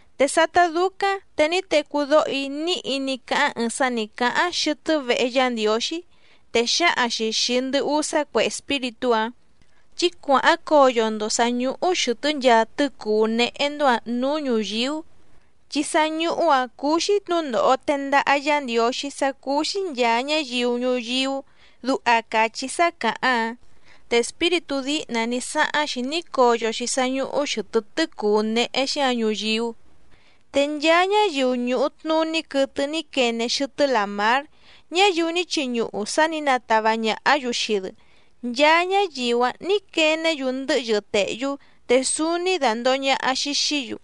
Te sátá dúcáⁿ te ní tecú dóho‑í níhi ní cáháⁿ ɨɨⁿ sá nǐ cáháⁿ xɨtɨ́ vehe Yá Ndiǒxí, te xǎhaⁿ‑xi xìi ndɨ usá cue espíritú‑áⁿ: —Chí cuàháⁿ coyo‑ndo sǎ ñúhú xɨ̀tɨ́ nchaa tɨ́cùú néhé‑ndó‑ǎⁿ nǔú ñùyíú, chi sá ñúhú‑ǎⁿ cúú‑xí tnǔndòho tendaha Yá Ndiǒxí sá cúú‑xí nchàa ñáyiu ñuyíú —duha càchí sá càháⁿ‑áⁿ. Te espíritú díhna ní sáháⁿ‑xi ní coyo‑xi sá ñúhú xɨ̀tɨ́ tɨ́cùú néhé‑xí‑ǎⁿ ñuyíú, te nchaa ñáyiu ñùhu tnuní quɨtɨ ní quene xɨtɨ́ làmár ñáyiu ní chiñuhu sá nǐ natava ñàhá‑yu xii‑dɨ, nchaa ñáyiu‑áⁿ nǐ quené‑yu ndɨ́hyɨ tèhyú te súúní dàndoho ñaha‑xi xií‑yu.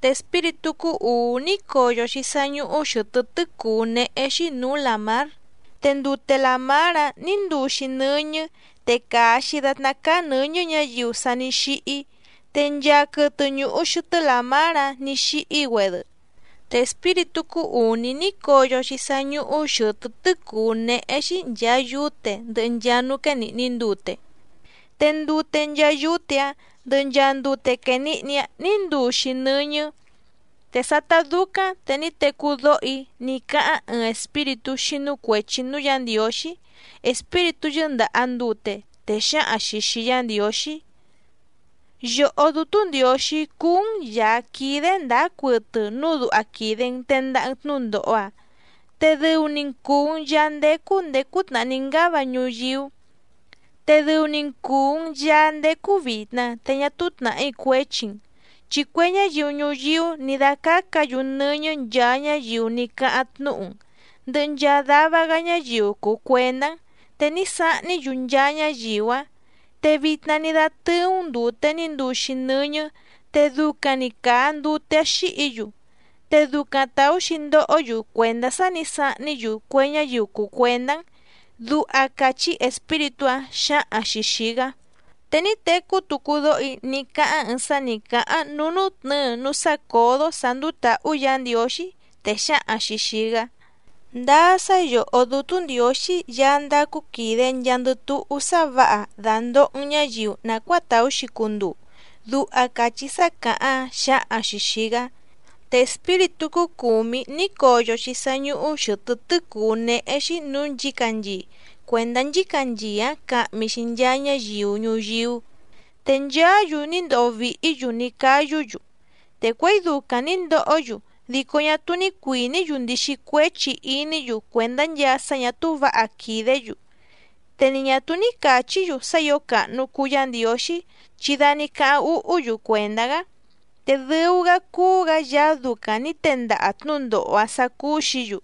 Te espíritú cúú ùú ní coyo‑xi sá ñúhú xɨ̀tɨ́ tɨ́cùú néhé‑xí nǔú làmár, te ndute làmár‑áⁿ nǐ nduu‑xi nɨ́ñɨ́ te càa‑xi datná cáá nɨ̌ñɨ́ ñǎyiu sa ní xíhí, te nchaa quɨtɨ ñùhu xɨtɨ́ làmár‑áⁿ nǐ xíhí‑güedɨ. Te espíritú cúú ùní ní coyo‑xi sá ñúhú xɨ̀tɨ́ tɨ́cùú néhé‑xí nchàa yúte ndɨhɨ nchaa núú quénìhni ndute, te ndute nchaa yúte‑áⁿ ndɨhɨ nchaa ndute quènihni‑áⁿ nǐ nduu‑xi nɨ́ñɨ́. Te sátá dúcáⁿ te ní tecú dóho‑í ní cáháⁿ ɨɨⁿ espíritú xínú cuèchi núú Yǎ Ndiǒxí, espíritú yɨ́ndàha ndute, te xǎhaⁿ‑xi xìi Yá Ndiǒxí: —Yòhó Dútú Ndiǒxí cúú‑n Yàá quídé ndǎá cuɨtɨ núu duha quìde‑n tendaha‑n tnúndòho‑a, te dɨu‑ni‑n cùu‑n Yaá ndécú ndèé cútnàhá ní ngáva ñuyíú, te dɨu‑ni‑n cùu‑n Yaá ndécú vìtna te ñá túú tnàhí cuéchi‑n. Chi cue ñáyiu ñuyíú nǐ dácácǎ‑yu nɨ́ñɨ́ nchaa ñáyiu ní cáháⁿ tnúhu‑n ndɨhɨ nchaa dava‑gá ñáyiu cùu cuendá‑n, te ní sahní‑yu nchaa ñáyiu‑áⁿ, te vitna ní dátɨ́ú‑n ndùte ní nduu‑xi nɨ́ñɨ́ te ducaⁿ‑ni càa ndute‑áⁿ xíhǐ‑yu, te ducaⁿ tàú‑xi ndohó‑yu cuèndá sá nǐ sahní‑yu cue ñáyiu cùu cuendá‑n —duha càchí espíritú‑áⁿ xǎhaⁿ‑xi xìi‑gá. Te ní tecú tucu dóho‑í ní cáháⁿ ɨɨⁿ sá nǐ cáháⁿ núú nútnɨ̌ɨ núú sácǒdó sǎ ndúú tǎhú Yǎ Ndiǒxí, te xǎhaⁿ‑xi xìi‑gá: —Ndáá sá yòhó Dútú Ndiǒxí Yaá ndácú quìde nchaandɨ túhú sá vǎha dàndoho‑n ñáyiu nàcuáa tàú‑xi cunduu —duha càchí sá càháⁿ‑áⁿ xǎhaⁿ‑xi xìi‑gá. Te espíritú cúú cùmí ní coyo‑xi sá ñúhú xɨ̀tɨ́ tɨ́cùú néhé‑xí nǔú nchǐcanchii cuèndá nchícanchii‑áⁿ cahmi‑xi nchaa ñáyiu ñuyíú. Te nchaá‑yu ní ndoho vìhí‑yu ní cáyú‑yu, te cuěi ducaⁿ nǐ ndohó‑yu dico ñá túú ní cuìní‑yu ndixi cuéchi iní‑yu cuèndá nchaa sá ñà túú vǎha quìdé‑yu, te ni ñà túú ní càchí‑yu sá ǐo càhnu cuu Yá Ndiǒxí chi da ní cáháⁿ úhú‑yu cuèndá‑gá, te dɨu‑gá cúú‑gǎ Yaá ducaⁿ nǐ tendaha tnǔndòho‑áⁿ sǎ cúú‑xǐ‑yu.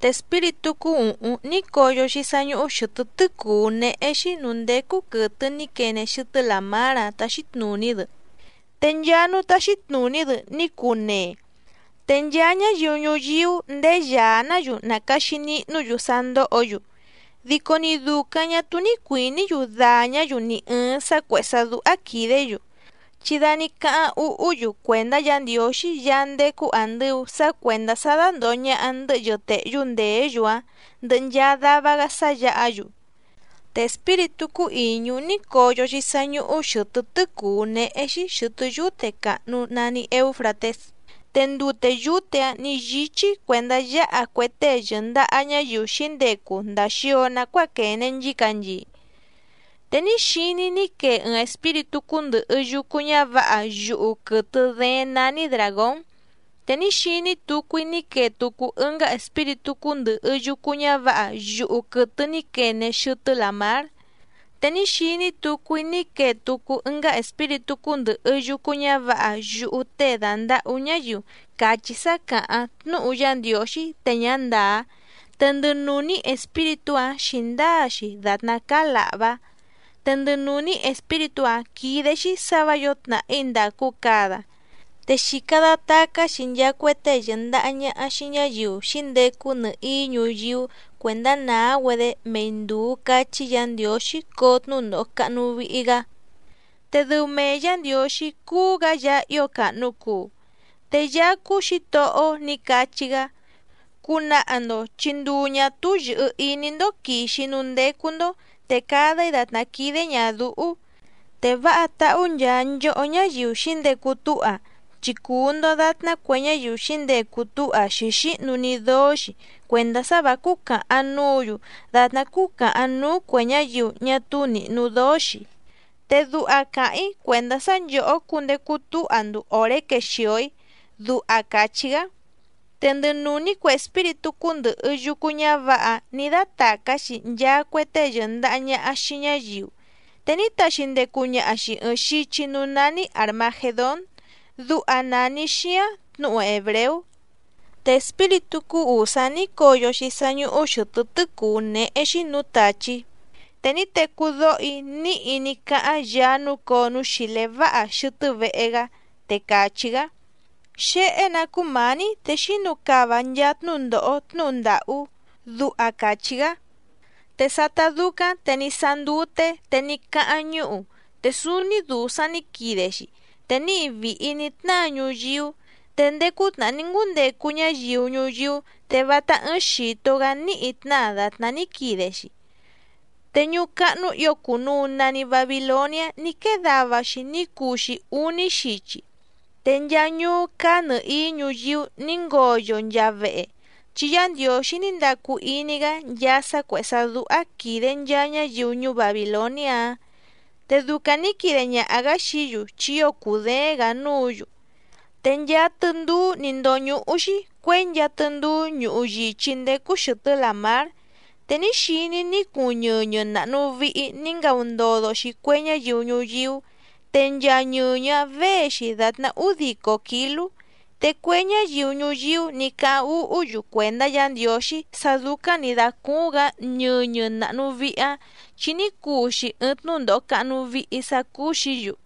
Te espíritú cúú ùhúⁿ ní coyo‑xi sá ñúhú xɨ̀tɨ́ tɨ́cùú néhé‑xí nǔú ndécú quɨ̀tɨ ní quene xɨtɨ́ làmár‑áⁿ táxí tnùní‑dɨ, te nchaa núú táxí tnùní‑dɨ ní cuu nee, te nchaa ñáyiu ñuyíú ndéé yàá‑ná‑yu nàcaxi nihnú‑yu sá ndóhǒ‑yu. Dico ni dùcaⁿ ñá túú ní cuìní‑yu dàñá‑yu ni ɨ̀ɨⁿ sá cuèhé sá dúhá quìdé‑yu, chi da ní cáháⁿ úhú‑yu cuèndá Yǎ Ndiǒxí Yaá ndécú àndɨu sá cuèndá sá dándòho ñaha ndɨ́hyɨ tèhyú ndèé‑yu‑áⁿ ndɨhɨ nchaa dava‑gá sá yǎha‑yu. Te espíritú cúú ìñú ní coyo‑xi sá ñúhú xɨ̀tɨ́ tɨ́cùú néhé‑xí xɨ̀tɨ́ yúte càhnu nani Eúfratés, te ndute yúte‑áⁿ nǐ yíchí cuèndá yǎha cue tée yɨ̀ndaha ñáyiu xǐndecu ndàa xio nacuáa quène nchícanchii. Te ní xiní‑í ní quee ɨɨⁿ espíritú cúndɨ̀hɨ yucu ñávǎha yuhu quɨtɨ dééⁿ nání dràgón, te ní xiní tucu‑í ní quee tucu ɨngá espíritú cúndɨ̀hɨ yucu ñávǎha yuhu quɨtɨ ní quene xɨtɨ́ làmár, te ní xiní tucu‑í ní quee tucu ɨngá espíritú cúndɨ̀hɨ yucu ñávǎha yuhu tée dàndahú ñáyiu càchí sá càháⁿ tnúhu Yá Ndiǒxí te ñá ndàá, te ndɨ nùní espíritú‑áⁿ xǐndáa‑xi dàtná cáá làhvá. Te ndɨ nùní espíritú‑áⁿ quídé‑xí sǎ vǎ yǒo tnàhí ndàcu cada, te xìca datacá‑xi nchaa cue tée yɨ̀ndaha ñaha xii ñáyiu xǐndecu nɨhìí ñuyíú cuèndá nàá‑güedé mei ndùu cachí Yǎ Ndiǒxí coo tnúndòho cahnu vihi‑gá, te dɨu mee Yǎ Ndiǒxí cúú‑gǎ Yaá ío càhnu cuu. Te Yaá cúú Xǐtohó‑ó nǐ cachí‑gá: “Cunaha‑ndo chi nduu ñà túú yɨ̀hɨ iní‑ndó quìxi‑í núú ndécú‑ndó, te cada‑í dàtná quídé ñàdúhú. Te váha táhú nchaa nchòhó ñáyiu xǐndecu túha, chi cùu‑ndo datná cue ñáyiu xǐndecu túha xǐxíhnu‑ni dóó‑xi cuèndá sá vǎ cúcàhaⁿ núǔ‑yu dàtná cúcàhaⁿ núú cuè ñáyiu ñá túú nìhnu dóó‑xi, te duha càháⁿ‑í cuèndá sá nchòhó cundecu túha‑ndo òré quexìo‑í”, duha càchí‑gá. Te ndɨ nùní cue espíritú cúndɨ̀hɨ yucu ñávǎha‑áⁿ nǐ dátàcá‑xi nchaa cue tée yɨ̀ndaha ñaha xii ñáyiu, te ní taxi ndecu ñaha‑xi ɨ̀ɨⁿ xichi núú nání Àrmagedón, duha nàni xíáⁿ tnǔhu hèbreú. Te espíritú cúú ùsá ní coyo‑xi sá ñúhú xɨ̀tɨ́ tɨ́cùú néhé‑xí nǔú tàchí, te ní tecú dóho‑í níhi ní cáháⁿ Yaá núcǒo núú xìlé váha xɨtɨ́ vehe‑gá, te càchí‑gá: —Xéhé‑nǎ cúmǎní te xínu cava nchaa tnúndòho tnúhu ndàhú —duha càchí‑gá. Te sátá dúcáⁿ te ní sáá ndúté te ní cáháⁿ ñúhu, te súúní dùsaⁿ ní quide‑xi, te níhi vìhi ní tnáa ñuyíú, te ndéé cútnàhá ní ngúndecu ñáyiu ñuyíú te vátá ɨ́ɨ́ⁿ xìto‑gá níhi tnáa dàtná ní quide‑xi. Te ñuú cáhnú ǐo cùnuu nani Babiloniá ní quée dava‑xi ní cuu‑xi úní xichi, te nchaa ñuú cáá nɨ̀hií ñuyíú nǐ ngoyo nchaa vehe, chi Yá Ndiǒxí ní ndacu iní‑gá nchaa sá cuèhé sá dúhá quìde nchaa ñáyiu ñuú Babìloniá‑áⁿ, te ducaⁿ nǐ quide ñaha‑gǎ xií‑yu chi ío cùdééⁿ‑gǎ núǔ‑yu. Te nchaa tɨndúú nǐ ndóñúhú‑xí cuěi nchaa tɨndúú ñuhu yìchí ndécú xɨ̀tɨ́ làmár. Te ní xiní‑í ní cuuⁿ ñɨñɨ nàhnu vihi ní ngaundodo‑xi cue ñáyiu ñuyíú, te nchaa ñɨñɨ‑áⁿ věe‑xi dàtná údico kǐlú, te cue ñáyiu ñuyíú nǐ cáháⁿ úhú‑yu cuèndá Yǎ Ndiǒxí sá dúcáⁿ nǐ dácúúⁿ‑gǎ ñɨñɨ nàhnu vihi‑áⁿ, chi ní cuu‑xi ɨɨⁿ tnúndòho cahnu vihi sá cúú‑xǐ‑yu.